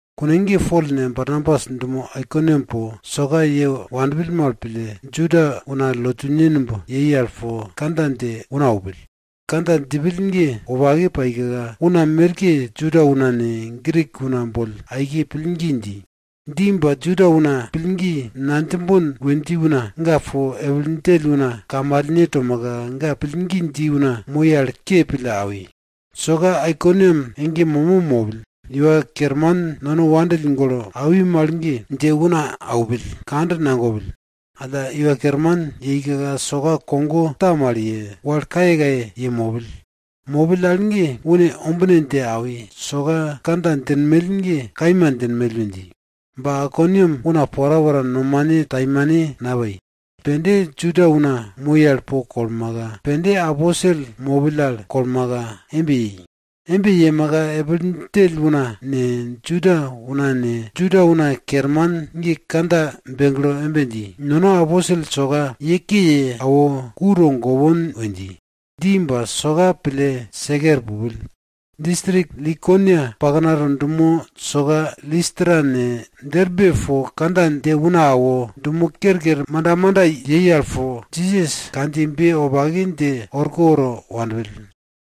Kune ge Pol ne, Barnabas dumo Aikoniam po, soka ye wanpill mal pille, Juda una lotune numb yei al po kandja dje una aupill. Kandja djipill ge wopake paika, una merke Juda una ne, Grik una boll aike pillgi dji. Dji ba Juda una, pillgi nadjimbon we dji una, ga po epil djell una kamalne tomaka, ga pillgi dji una moi al ke pille awi. Soka Aikoniam ege momo mopill. Iwa Kerman nono wopake pille awi mal ge, dje una aupill, kand nagopill. Alla Iwa Kerman yeika soka kogo ta mal ye, wal kayekaye ye mopill. Mopill al ge, une ombine dje awi, soka kandja djinmell ge kaima djinmell we dji. Ba Aikoniam una porapora nomane taimane napai. Pende Juda una moi al po kolmaka, pende aposel mopill al kolmaka embe yei. Embe yemaka, epil djell una ne, Juda una ne, Juda una kerman ge kandja begle embe dji, nono aposel soka ye ke ye awo, ku togopon we dji. Dji ba soka pille seke er pupill. Distrik Likonia paknato dumo soka Listra ne, Derbe po kandja dje una awo, dumo kerker manda manda yei al po Jisas kandjiyebe wopake dje orko woro wanpill.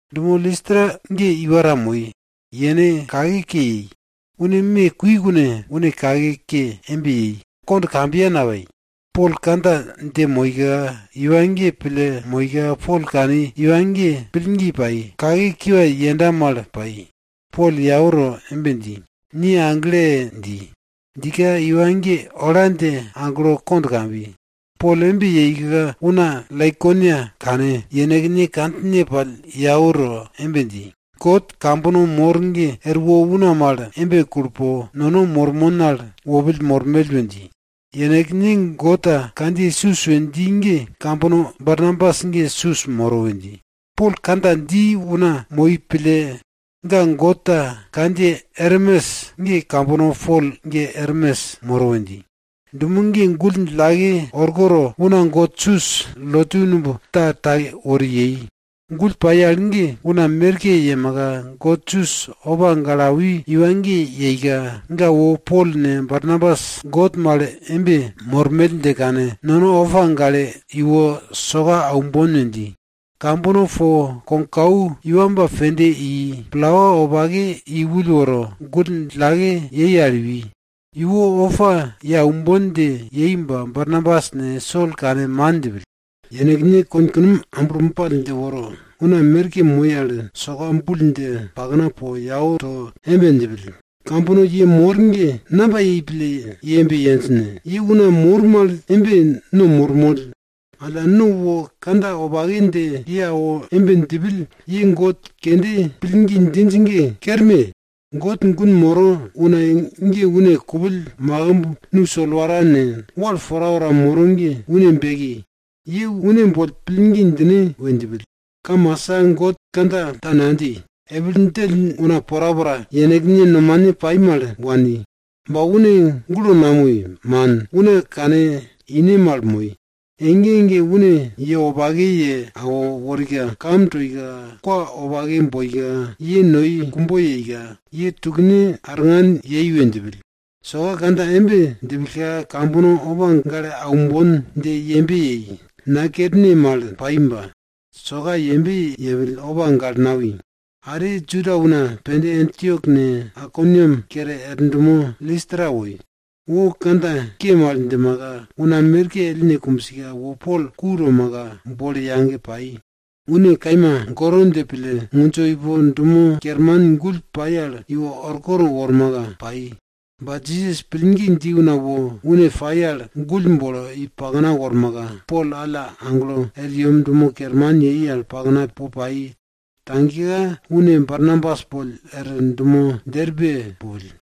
Dumo Listra ge iwa ta moi. Yene kake ke yei. Une me kui kune, une kake ke embe yei, kond kambiya napai. Pol kandja dje moika iwa ge pille moika, Pol kani, iwa ge pillgi pai, kake kiwa yenda mal pai. Pol yau to embe dji, ni agle! dji. Djika iwa ge ola dje aglo kond kambi. Pol embe yeika Laikonia una kane, yenekne kandjine pall yau to embe dji, god kambono mor ge erwo una mal embe kulo po, nono mormon al wopill mormell! we dji. Yenekne god ta kandjiye Sus we dji ge kambono Barnabas ge Sus moro we dji. Pol kandja dji una moi pille, ga god ta kandjiye Ermes ge kambono Pol ge Ermes moro we dji. Dumo ge gull djillake orko to, una god Sus lotu numb ta take wori yei. Gull pai al ge una merke yemaka, god Sus opa gale awi iwa ge yeika, ga wo Pol ne, Barnabas god mal embe mormell dje kane, nono opa gale iwo soka aumbon we dji. Kambono po kogkau iwamba pende i, plawa wopake i ull woro, gull djillake yei al iwi. Iwo opa ye aumbon dje yei ba, Barnabas ne, Sol kane man djipill. Yenekne konkunom amblo ball dje woro, una merke moi al soka bul dje pakna po yau to embe djipill, kambono ye mor ge! Namba yei pille ye embe yenj ne? Ye una mor mal embe, no mormoll. Alla, no wo kandja wopake dje ye awo embe djipill, ye god kende pillgi djinj ge kerme! God gun moro una ge une kupill makimb, nu solwara ne, wal porapora moro ge une beki, ye une boll pillgi djine we djipill. Kamasa God kandja ta nadji, epil djell una porapora yenekne nomane pai mal wani. Ba une gulo namoi, man. Una kane ine mal moi. Ege ege une ye wopake ye awo worika, kam toika, kwa wopake boika, ye noi kumbo yeika, ye tukne arngan yei we djipill. Soka kandja embe djipillka, kambono opa gale aumbon dje yembe yei, nakerne mal pai ba, soka yembe yepill, opa gale nawi. Are Juda una pende Antiok ne, Aikoniam kere er dumo Listra woi. Wo kandja ke mal djimaka, una merke ellne kumbsika, wo Pol ku tomaka, bolo yage pai. Une kaima goro dje pille, ngundjo ipo dumo kerman gull pai al iwo orkoto wormaka, pai. Ba Jisas pillgi dji una wo une pai al, gull bolo i pakna wormaka, Pol alla aglo er yem dumo kerman pakna po pai. Tagika, une Barnabas boll er dumo Derbe pupill.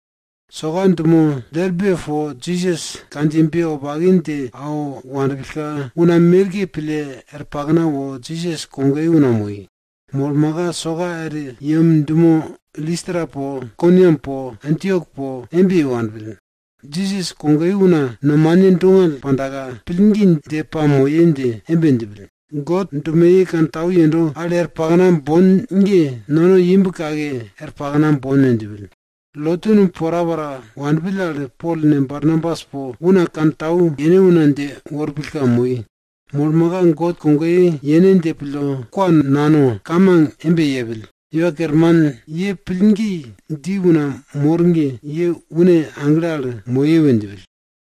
Soka dumo Derbe po Jisas kandjiyebe wopake dje awo wanpillka, una merke pille er pakna wo Jisas kogoye una moi. Molmaka, soka er yem dumo Listra po, Aikoniam po Antiok po embe ye wanpill. Jisas kogoye una nomane dongall pandaka, pillgi dje pamoye dje embe djipill, God dumoye wopake kantau yendo al er pakna bon ge, nono imb kake er pakna bon we djipill. Lotu numb porapora wanpill al, Pol ne, Barnabas po una kantau yene una dje worpillka moi. Molmaka soka ga God kogoye yene dje pille, kwa nano, kamang embe yepill, Iwa Kerman, ni pillgi dji una mor ge, kantau yembena moye we djipill.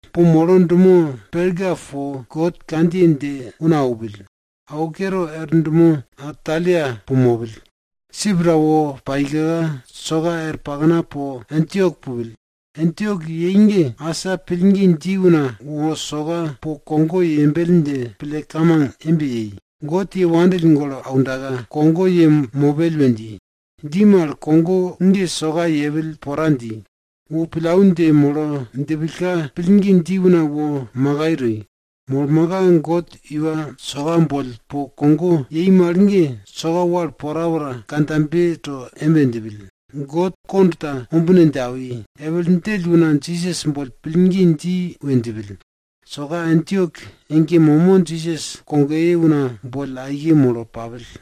Po molo dumo Perga po God kandjiye dje una aupill. Awo kere, er dumo Atalia po mopill. Sip ta wo paika, soka er pakna po Antiok pupill. Antiok yei ge, asa pillgi dji una wo soka po kogo yembell dje pille kamang embe yei, God ye wopake pille aundaka, kogo ye mopell we dji. Dji mal kogo ge soka yepill pora dji. Wo pillau dje molo djipillka, pillgi dji una wo makai toi. Molmaka, God iwa soka boll po kogo yei mal ge, soka wal porapora kandjabe to embe djipill, God kond ta ombine dje awi, epil djell una Jisas boll pillgi dji we djipill. Soka Antiok ege momo Jisas kogoye una boll aike molo papill.